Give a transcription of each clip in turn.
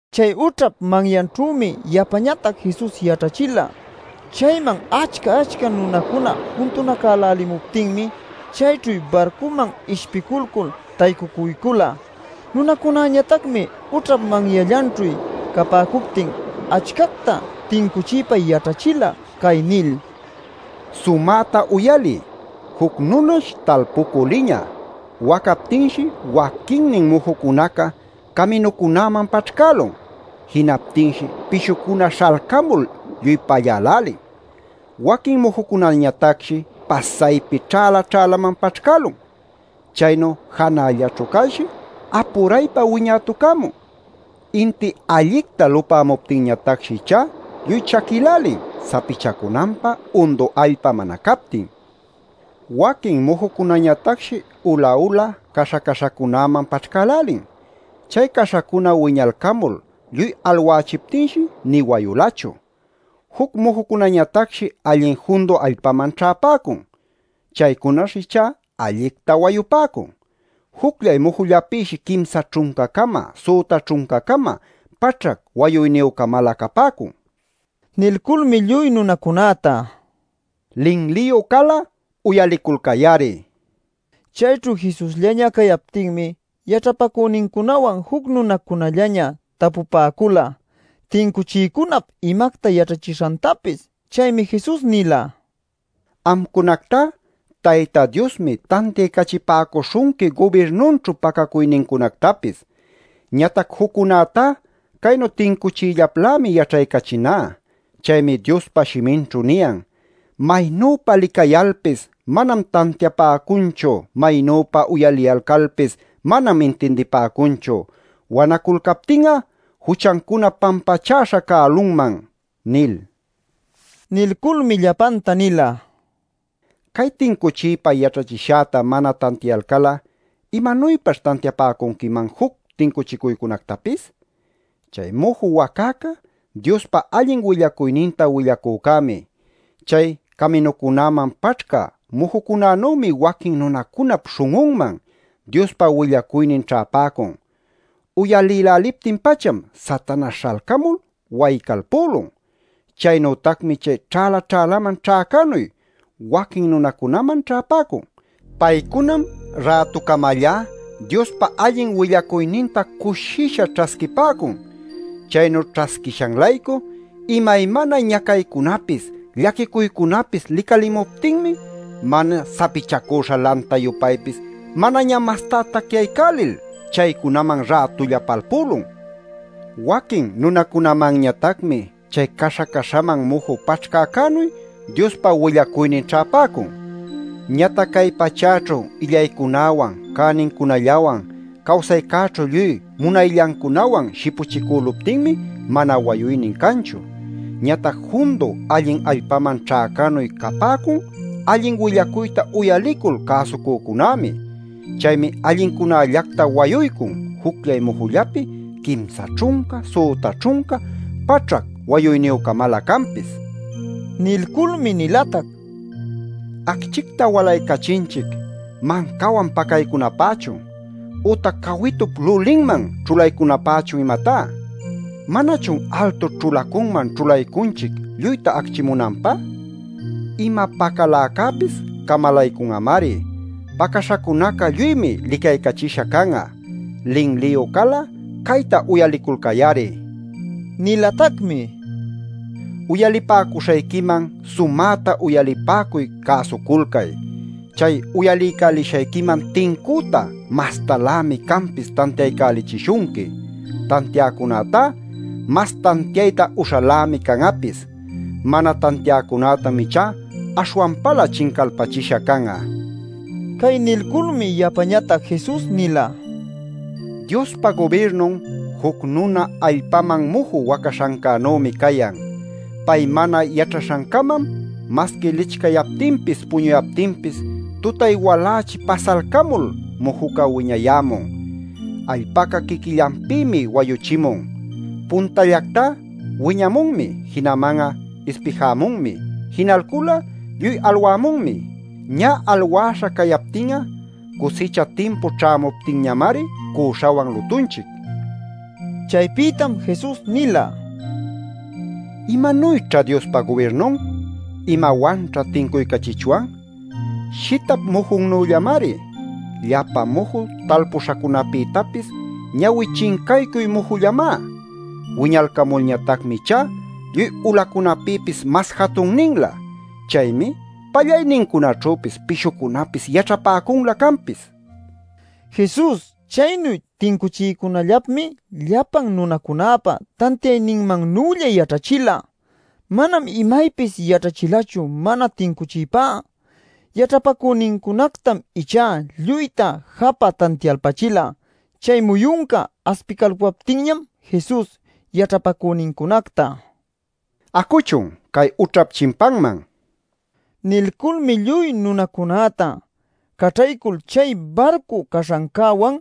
Chay ućhap manyanćhümi yapañatac Jesus yaćhachila. Chayman achca-achca nunacuna juntunacälälimuptinmi, chayćhu barcuman ishpilcul taycucuycula. Nunacunañatacmi ućhap manyallanćhu capäcuptin achcacta tincuchiypa yaćhachila cay nil: “Sumäta uyaliy. Juc nunash talpucü liñä. Wacaptinshi waquinnin mujucunaca caminucunäman paćhcälun. Jinaptinshi pishucuna śhalcamul lluy pallälälin. Waquin mujucunañatacshi pasaypi ćhäla-ćhälaman paćhcälun. Chaynu janällaćhu calshi apuraypa wiñätucämun. Inti allicta lupämuptinñatacshi ichá lluy chaquïlälin, sapichacunanpä undu allpa mana captin. Waquin mujucunañatacshi ula-ula, caśha-caśhacunäman paćhcälälin. Chay caśhacuna wiñalcamul lluy alwächiptinshi nï wayulachu. Juc mujucunañatacshi allin jundu allpaman ćhäpäcun. Chaycunash ichá allicta wayupäcun. Jucllay mujullapïshi quimsa ćhunca-cama, süta ćhunca-cama, paćhac wayuyniyü-camalä capäcun” nil. Nilculmi lluy nunacunäta: “¡Linliyu cal'a, uyaliculcay-ari!” nila. Chayćhu Jesusllaña cayaptinmi, yaćhapacünincunawan juc nunacunallaña tapupäcula tincuchiycunap imacta yaćhachishantapis. Chaymi Jesus nila: “Amcunactá Tayta Diosmi tantiaycachipäcuśhunqui gubirnunćhu pacacuynincunactapis. Ñatac juccunätá caynu tincuchiyllaplämi yaćhaycachiná. Chaymi Diospa shiminćhu niyan: ‘Maynüpa licayalcalpis manam tantiapäcunchu; maynüpa uyaliyalcalpis manam intindipäcunchu; wanaculcaptin'a juchancunam pampachäśha cälunman’ nil” nila. Nilculmi llapanta nila: “Cay tincuchiypa yaćhachishäta mana tantiayalcal'a, ¿imanuypaćh tantiapäcunquiman juc tincuchiycunactapis? Chay muju wacäca Diospa allin willacuyninta willacücämi. Chay caminucunäman paćhcä mujucunanümi waquin nunacunap śhun'unman Diospa willacuynin ćhäpäcun. Uyalïläliptin-pacham Satanaśh śhalcamul waycalpülun. Chaynütacmi chay ćhäla-ćhälaman ćhäcänuy waquin nunacunaman ćhäpäcun. Paycunam rätucamallá Diospa allin willacuyninta cushisha ćhasquipäcun. Chaynu ćhasquishan-laycu imaymana ñacaycunapis, llaquicuycunapis licalimuptinmi mana sapichacüśha lanta-yupaypis manaña mastá tacyaycälil chaycunaman rätulla palpülun. Waquin nunacunamanñatacmi chay caśha-caśhaman muju paćhcäcänuy Diospa willacuynin ćhäpäcun. Ñatac cay pachäćhu illaycunäwan, cänincunallawan, cawsaycäćhu lluy munayllancunawan shipuchicüluptinmi mana wayuynin canchu. Ñatac jundu allin allpaman ćhäcänuy capäcun allin willacuyta uyalicul cäsucücunämi. Chaymi allincunällacta wayuycun jucllay mujullapi quimsa ćhunca, süta ćhunca, paćhac wayuyniyü-camalä canpis” nila. Nilculmi nilatac: “¿Acchicta walaycachinchic mancawan pacaycunapächun ütac cawitup lulinman ćhulaycunapächun, imatá? ¿Manachun altu ćhulacunman ćhulaycunchic lluyta acchimunanpä? Ima pacaläcäpis camalaycun'amari. Pacäśhacunaca lluymi licaycachisha can'a. Linliyu cal'a cayta uyaliculcay-ari” nil. Nilatacmi: “Uyalipäcuśhayquiman sumäta uyalipäcuy, cäsuculcay. Chay uyaliycälishayquiman tincüta mastalämi canpis tantiaycälichishunqui. Tantiäcunätá mas tantiayta uśhalämi can'apis. Mana tantiäcunätam ichá aśhwanpalä chincalpachisha can'a” nil. Cay nilculmi yapañatac Jesus nila: “Diospa gubirnun juc nuna allpaman muju wacaśhancänümi cayan. Pay mana yaćhaśhancamam masqui licchayaptinpis puñuyaptinpis tutay-walächi pasalcamul mujuca wiñayämun. Allpaca quiquillanpïmi wayuchimun: puntallactá wiñamunmi, jinaman'a ispijämunmi, jinalcul'a lluy alwämunmi. Ñä alwäśha cayaptin'a cusicha timpu ćhämuptinñamari cüśhawan lutunchic” nil. Chaypïtam Jesus nila: “¿Imanuyćha Diospa gubirnun? ¿Imawanćha tincuycachichwan? Shitap mujunnüllamari. Llapa muju talpuśhacunäpïtapis ñawi chincaycuy mujullamá. Wiñalcamulñatacmi ichá lluy ulacunapïpis mas jatunninlä. Chaymi pallaynincunaćhüpis pishucunapis yaćhapäcunlä canpis” nil. Jesus chaynu tincuchiycunallapmi llapan nunacunäpa tantiayninmannülla yaćhachila. Manam imaypis yaćhachilachu mana tincuchiypá. Yaćhapacünincunactam ichá lluyta japä tantialpachila. Chay muyunca aspicalpuyaptinñam Jesus yaćhapacünincunacta: “Acuchun, cay ućhap chimpanman” nila. Nilculmi lluy nunacunäta caćhaycul chay barcu caśhancäwan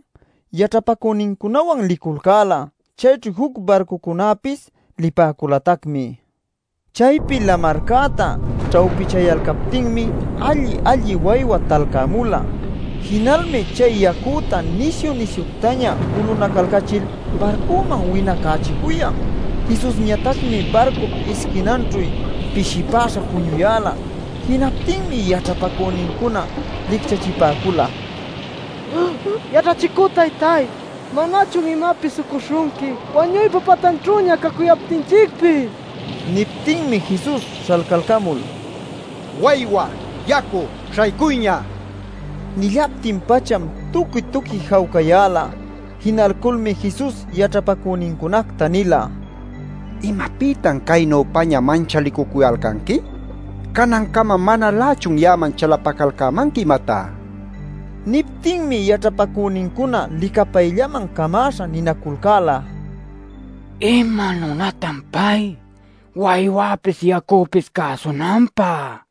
yaćhapacünincunawan liculcäla. Chayćhu juc barcucunapis lipäculatacmi. Chaypi lamarcäta ćhawpichaycuyalcaptinmi alli-alli waywa talcämula. Jinalmi chay yacüta nisyu-nisyuctaña ulunacalcachil barcuman winacächicuyan. Jesusñatacmi barcup isquinanćhu pishipäśha puñuyäla. Jinaptinmi yaćhapacünincuna licchachipäcula: “¡Yaćhachicü taytáy ¿manachun imapis ucuśhunqui wañuypa patanćhüña cacuyaptinchicpis?!” nilcul. Niptinmi Jesus śhalcalcamul: “¡Waywa, yacu, śhaycuyña!” nïlun. Nillaptin-pacham tuqui-tuqui jawcayäla. Jinalculmi Jesus yaćhapacünincunacta nila: “¿Imapïtan caynüpaña manchalicucuyalcanqui? ¿Canancama manalächun ya'aman chalapacalcämanqui, imatá?” nil. Niptinmi yaćhapacünincuna licapayllaman camäśha ninaculcäla: “¿Ima nunatan pay, waywäpis yacüpis cäsunanpä?” nil.